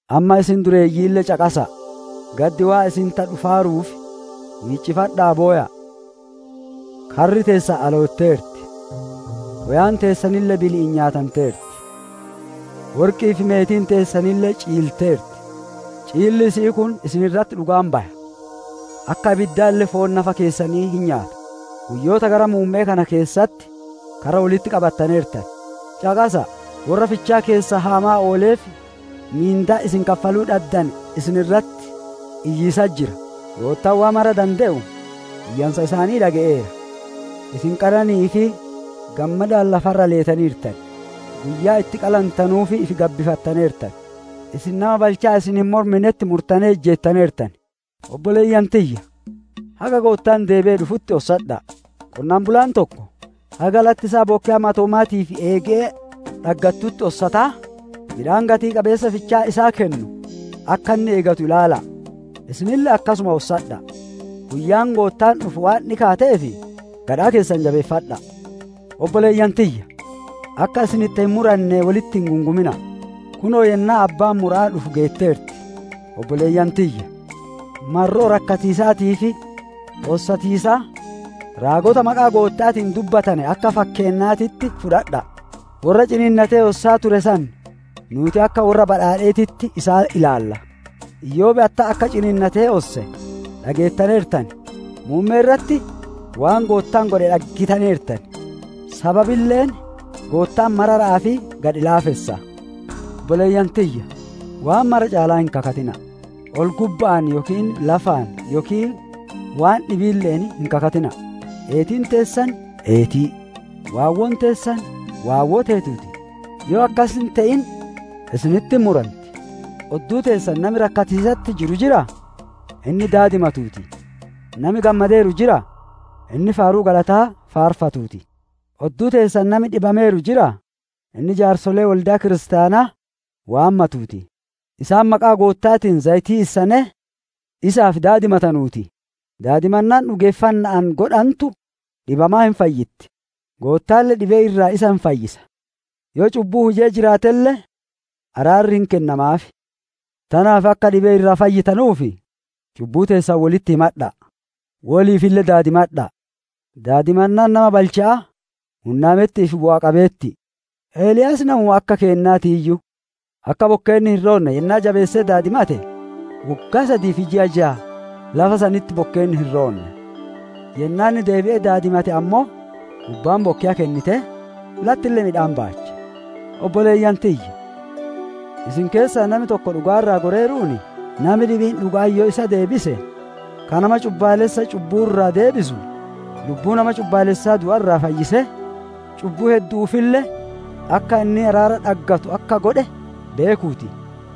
Amma isin dureeyyiille caqasa'a! Gaddi waan isinitti dhufaaruuf, wiiccifadha'aa bowa'a. Karri teessan alootteerti; woyaan teessanille bili'iin nyaatanteerti. Worqi'ii fi meetiin teessan ciilteerti; ciilli isaanii kun isin irratti dhugaa hin baya, akka ibiddaalle foon nafa keessanii hin nyaata. Guyyoota gara muumme'ee kana keessatti karra wolitti qabattaneertan. Caqasa'a! Worra fichaa keessan haamaa ooleef mindaan isin kaffaluu dhaddane isin irratti iyyiisatti jira; Goottaan Waan Mara Dade iyyansa isaanii dhage'eera. Isin qanani'ii fi gammadaan lafa irra leetaneertan; guyyaa itti qalantanuuf ifi gabbifattaneertan. Isin nama balchaa isin hin morminetti murtanee ijjeettaneertan. Obboleeyyan tiyya! Haga Goottaan deebi'ee dhufutti ossadha'a. Qonnaan bulaan tokko haga latti isaa bokkeya matoomaatii fi eege'ee dhaggattutti ossataa, midhaan gatii-qabeessa fichaan isaa kennu, akka inni eegatu ilaala'a. Isinille akkasuma ossadha'a! Guyyaan Goottaan dhufu waan dhikaatteef, gadhaa keessan jabeeffadha'a. Obboleeyyan tiyya! Akka isinitti hin muranne wolitti hin gungumina'a! Kunoo yennaan abbaan mura'aa dhufu geetteerti. Obboleeyyan tiyya! Marroo rakkatiisaatii fi ossatiisaa, raagota maqaa Gootta'aatiin dubbatane akka fakkeennaatitti fudhadha'a! Worra ciniinnatee ossaa ture san, nuuti akka worra badhaadheetitti isaan ilaalla. Iyoob attam akka ciniinnatee osse dhageettaneertan; muummee irratti waan Goottaan godhe dhaggitaneertan; sababille Goottaan marara'aa fi gadhi-laafessa. Obboleeyyan tiyya! Waan mara caalaa hin kakatina'a! Ol-gubba'aan yookiin lafaan yookiin waan dhibiille'een hin kakatina'a! «Eetiin» teessan eeti, «Waawwoon» teessan waawwoo teetuu ti. Yoo akkas hin te'in, isinitti hin muranti. Odduu teessan nami rakkatiisatti jiru jiraa? Inni daadimatuu ti! Nami gammadeeru jiraa? Inni faaruu galataa faarfatuu ti. Odduu teessan nami dhibameeru jiraa? Inni jaarsolee wolde'a kiristaanaa waammatuu ti; isaan maqaa Gootta'aatiin zayitii issanee isaaf daadimatanuu ti. Daadimannaan dhugeeffanna'aan godhantu dhibamaa hin fayyitti; Goottaalle dhibee irraa isa hin fayyisa; yoo cubbuu hujee jiraatelle araarri hin kennamaaf. Tanaaf akka dhibee irraa fayyitanuuf, cubbuu teessan wolitti himadha'a, woliifille daadimadha'a! Daadimannaan nama balcha'aa hunnaametti'ii fi bu'aa qabeetti'i. Eliyaas namuma akka keennaatiiyyu; akka bokkeenni hin roonne yennaa jabeesse daadimate, woggaa sadii fi ji'a jaa lafa sanitti bokkeenni hin roonne. Yennaa inni deebi'ee daadimate ammoo, gubbaan bokkeya kennitee, lattille midhaan baache. Obboleeyyan tiyya! Isin keessaa nami tokko dhugaa irraa goreeruun, nami dhibiin dhuga'atti yoo isa deebise, ka nama cubbaalessa cubbuu irraa deebisu, lubbuu nama cubbaalessaa du'a irraa fayyisee, cubbuu heddu'uufille akka inni araara dhaggatu akka godhe beekuu ti.